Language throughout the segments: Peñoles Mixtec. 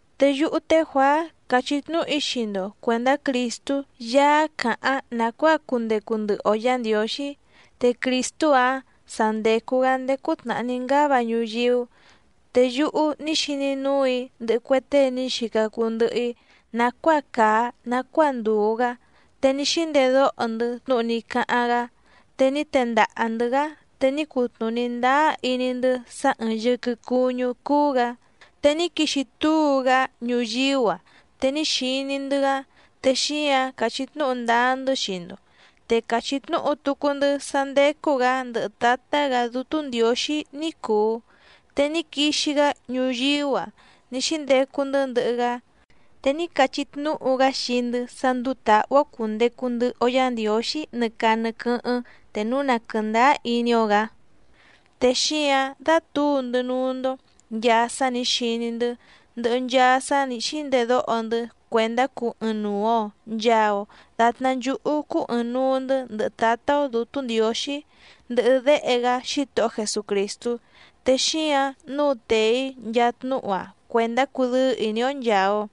Te yúhú té Juàá càchí tnúhu‑í xii‑ndo cuèndá Crìstú Yaá càháⁿ nàcuáa cundecu ndɨhɨ‑o Yǎ Ndiǒxí. Te Crìstú‑áⁿ sa ndècu‑gá ndéé cútnàhá ní ngáva ñuyíú. Te yúhú ní xiní núù‑í ndɨhɨ cue tée ní xica cuu ndɨhɨ‑í nàcuáa càa nacuáa ndùu‑gá. Te ní xíndedóho‑ndɨ́ tnúhu ní cáháⁿ‑gá, te ní tendaha‑ndɨ̌‑gá te ní cutnùní ndáá iní‑ndɨ́ sá ɨ̀ɨⁿ yɨquɨ cuñú cúú‑gǎ. Te ní quixi túu‑gá ñuyíú‑a, te ní xiní‑ndɨ́‑gá, te xíǎⁿ càchí tnúhu ndáá‑ndɨ́ xii‑ndo. Te càchí tnúhu tucu‑ndɨ́ sá ndécú‑gǎ ndɨhɨ Tǎtá‑gǎ Dútú Ndiǒxí ní cùu, te ní quixi‑gá ñuyíú‑a ní xíndecu‑ndɨ́ ndɨhɨ‑gá. Te ní cachí tnúhu‑gá xii‑ndɨ́ sá ndúú tǎhú‑ó cùndecu ndɨhɨ‑o Yá Ndiǒxí nɨ caa nɨ quɨ́hɨ́ⁿ te núu na quɨ̀ndáá iní‑ó‑gǎ. Te xíǎⁿ dátǔu‑ndɨ́ núú‑ndó nchàa sá nǐ xiní‑ndɨ́, ndɨhɨ nchaa sá nǐ xíndedóho‑ndɨ́ cuèndá cuu ɨɨⁿnuu‑o nchàa‑o datná nchúhú cúú ɨ̀ɨⁿnuu‑ndɨ́ ndɨhɨ Tǎtá‑ó Dǔtú Ndiǒxí, ndɨhɨ Déhe‑gá Xítohó Jesucrìstú. Te xíǎⁿ nǔu tèe‑í nchaa tnúhu‑a cuèndá cudɨ́ɨ́ ìní‑ó nchàa‑o.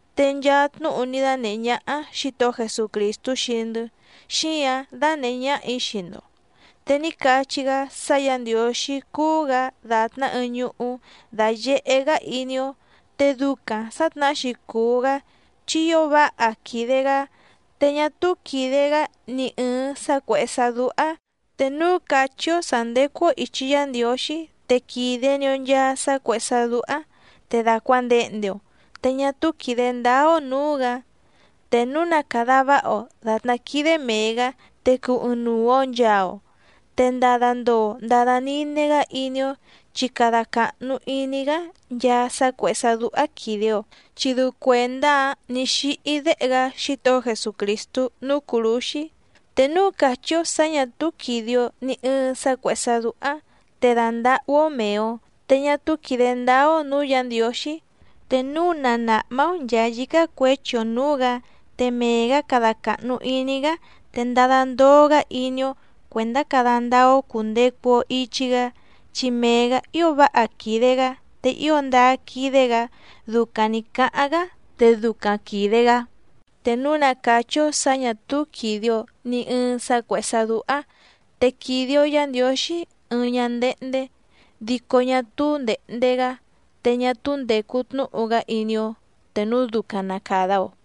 Te nchaa tnúhu ní dánèhé ñáhá Xǐtohó Jesucrìstú xii‑ndɨ́, xíǎⁿ dánèhé ñáhà‑í xii‑ndo. Te ní cachí‑gá sá Yǎ Ndiǒxí cúú‑gǎ dàtná ɨɨⁿ ñuhú dáyèhé‑gá iní‑ó, te ducaⁿ sǎtnahá‑xi cùu‑gá chi ío váha quìde‑gá, te ñá túú quìde‑gá ni ɨ̀ɨⁿ sá cuèhé sá dúhá. Te núu càchí‑ó sǎ ndécú‑ó ìchi Yá Ndiǒxí, te quìde‑ni‑o nchaa sá cuèhé sá dúhá, te dàcuandehnde‑o te ñá túú quìde ndáá‑ó nǔú‑gǎ. Te núu na càda váha‑o dàtná quídé mèe‑gá, te cuu ɨɨⁿnuu‑o nchàa‑o. Te ndada ndoo ndada nine‑gá iní‑ó, chi cada càhnu iní‑gá nchaa sá cuèhé sá dúhá quìde‑o, chi dɨu cuèndá‑áⁿ nǐ xíhí Déhe‑gá Xítohó Jesucrìstú núú cùrúxí. Te núu càchí‑ó sǎ ñà túú quìde‑o ni ɨɨⁿ sá cuèhé sá dúhá, te dàndahú‑ó mèe‑o, te ñá túú quìde ndáá‑ó nǔú Yǎ Ndiǒxí. Te núu na nàhmá‑ó nchàa yícá cuěchi‑o nǔú‑gǎ, te mee‑gǎ cada càhnu iní‑gá, te ndada ndoo‑gá iní‑ó, cuèndá cada ndáá‑ó cùndecu‑o ichi‑gá, chi mee‑gǎ ío váha quìde‑gá te ío ndáá quídé‑gǎ, ducaⁿ nǐ cáháⁿ‑gá te ducaⁿ quìde‑gá. Te núu na càchí‑ó sǎ ñà túú quìde‑o ni ɨɨⁿ sá cuèhé sá dúhá, te quìde‑o Yá Ndiǒxí ɨɨⁿ ñándéhndé, dico ñá túú ndèhnde‑gá. Te ñá túú ndècu tnúhu‑gá iní‑ó te núu ducaⁿ na càda‑o.